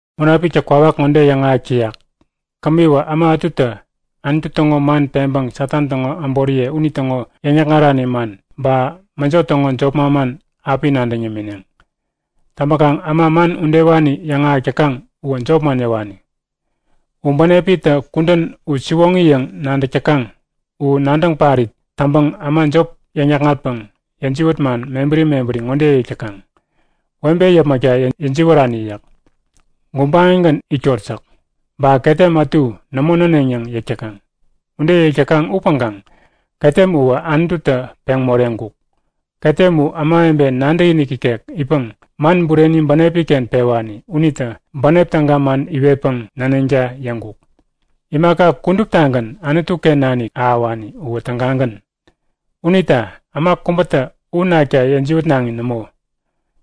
Munapiktä kwawak ŋode yäŋahäk täyak; Kämiwä äma ätutä Anutu täŋo man peŋpäŋ Satan täŋo äboriye unitäŋo yäŋ-yäkŋarani man ba mäjo täŋo jop manman api nadäŋ yämineŋ. Täŋpäkaŋ äma man udewani yäŋahäk täkaŋ uwä jopman yäwani. U bänepitä kudän u siwoŋi yäŋ nadäk täkaŋ u nadäŋ parit täŋpäŋ äma jop yäŋ-yäkŋatpäŋ yäjiwät man mebäri mebäri ŋode yäk täkaŋ; Webe yäpmäkta yäjiwärani yäk. Gubaŋigän itkot yäk. Ba, ketem ätu nämo näneŋ yäŋ yäk täkaŋ. Ude yäk täkaŋ upäŋkaŋ ketem uwä Anututä peŋ moreŋkuk. Ketem u ämawebe nadäkinik ikek itpäŋ man bureni bänepi-ken pewani unitä bänep täga man iwetpäŋ näneŋta yäŋkuk. Imaka kuduptagän Anutu-ken nanik ahäwani uwä tägagän. Unita äma kubätä u nakta yäjiwätnaŋi nämo.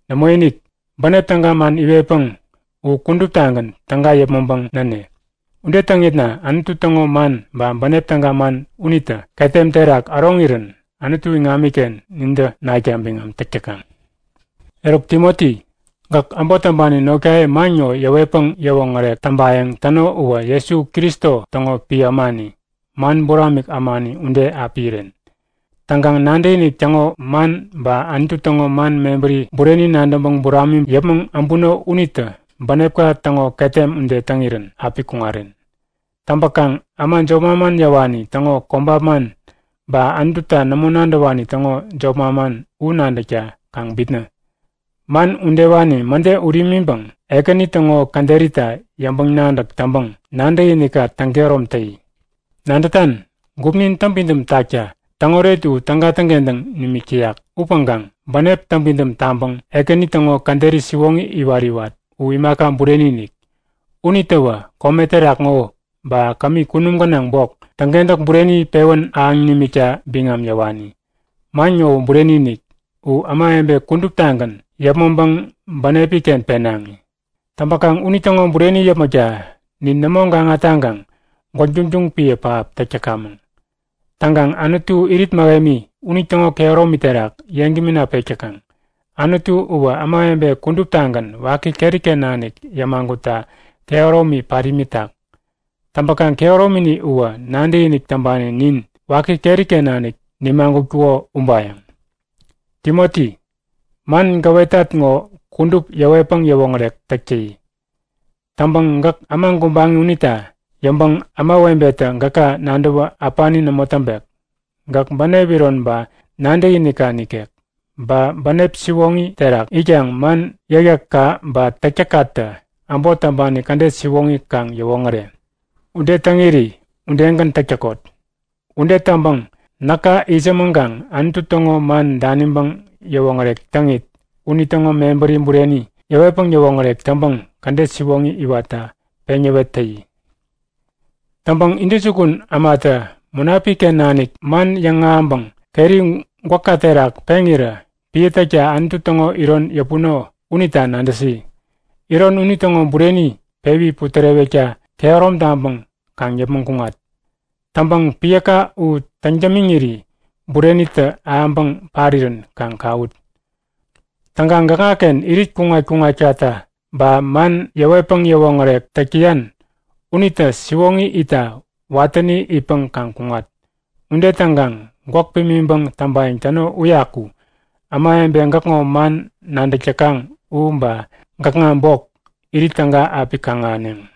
Nämoinik, bänep täga man iwetpäŋ u kuduptagän täga yäpmäŋpäŋ näne. Ude täŋitna Anutu täŋo man ba bänep täga man unitä ketem terak äroŋirän Anutu iŋamiken nintä nakta biŋam täk täkaŋ. Eruk Timoti, gäk äbot täŋpani notkaye man ŋo yäwetpäŋ yäwoŋärek täŋpayäŋ täno uwä Jesu Kristo täŋo piä ämani, man buramik ämani ude api iren. Täŋkaŋ nadäkinik täŋo man ba Anutu täŋo man mebäri bureni nadäŋpäŋ buramiŋ yäpmäŋ äbuno unitä bänepka täŋo ketem ude täŋirän api kuŋaren. Täŋpäkaŋ äma jop manman yäwani täŋo kobap man ba Anututa nämo nadäwani täŋo jop manman u nadäkta kaŋ bitnä. Man udewani mäde ut imiŋpäŋ Ekäni täŋo käderita yäŋpäŋ-nadäk täŋpäŋ nadäkinikka täŋkehärom täyi. Nadätan? Gupnin täŋpidäm takta täŋoret u täga täŋkentäŋ nimik täyak upäŋkaŋ bänep täŋpidäm taŋpäŋ Ekäni täŋo käderi siwoŋi iwat-iwat u imaka bureni-inik. Unitäwä kome terak ŋo, ba kämi kunum gänaŋ bok, täŋkentäk bureni pewän ahäŋ nimikta biŋam yäwani. Man ŋowä bureni-inik. U ämawebe kuduptagän yäpmäŋpäŋ bänepnin-ken penaŋi. Täŋpäkaŋ unitäŋo bureni yäpmäkta nin nämo gaŋa taŋkaŋ gwäk duŋduŋ piä pähap täk täkamäŋ. Täŋkaŋ Anutu irit mähemi, unitäŋo kehäromi terak yeŋgämina pek täkaŋ. Anutu uwä ämawebe kuduptagän waki keri-ken nanik yämagutta kehäromi pat imitak. Täŋpäkaŋ kehäromini uwä nadäkinik täŋpani nin waki keri-ken nanik nimagutkuko ubayäŋ! Timoti, man gäwetat ŋo kudup yäwetpäŋ yäwoŋärek täk täyi. Täŋpäŋ gäk äma gubaŋi unita yäŋpäŋ ämawebetä gäka nadäwä äpani nämo täŋpek. Gäk bänep iron ba nadäkinikka nikek, ba bänep siwoŋi terak itkaŋ man yäkyäkka ba täktäkkatä äbot täŋpani kädet siwoŋi kaŋ yäwoŋäre. Ude täŋiri udegän täk täkot. Ude täŋpäŋ näka itsämäŋkaŋ Anutu täŋo man daniŋpäŋ yäwoŋärek täŋit, unitäŋo mebäri bureni yäwetpäŋ yäwoŋärek täŋpäŋ, kädet siwoŋi iwatta peŋ yäwet täyi. Täŋpäŋ intäjukun ämatä Munapik-ken nanik man yäŋahäŋpäŋ keri gwäkka terak peŋirä piä täkta Anutu täŋo iron yäpuno unita nadäsi. Iron unitäŋo bureni pewi putärewekta kehärom taŋpäŋ kaŋ yäpmäŋ kuŋat. Täŋpäŋ piäka u täŋ-dämiŋiri burenitä ahäŋpäŋ parirän kaŋ kawut. Täŋkaŋ gäkŋaken irit kuŋat-kuŋatkata ba man yäwetpäŋ yäwoŋärek täk täyan unitä siwoŋi itta watäni itpäŋ kaŋ kuŋat. Ude täŋkaŋ gwäk pimiŋpäŋ täŋpayäŋ täno uyaku ämawebe gäkŋo man nadäk täkaŋ u, ba gäkŋa bok, irit täga api kaŋ-ahäneŋ.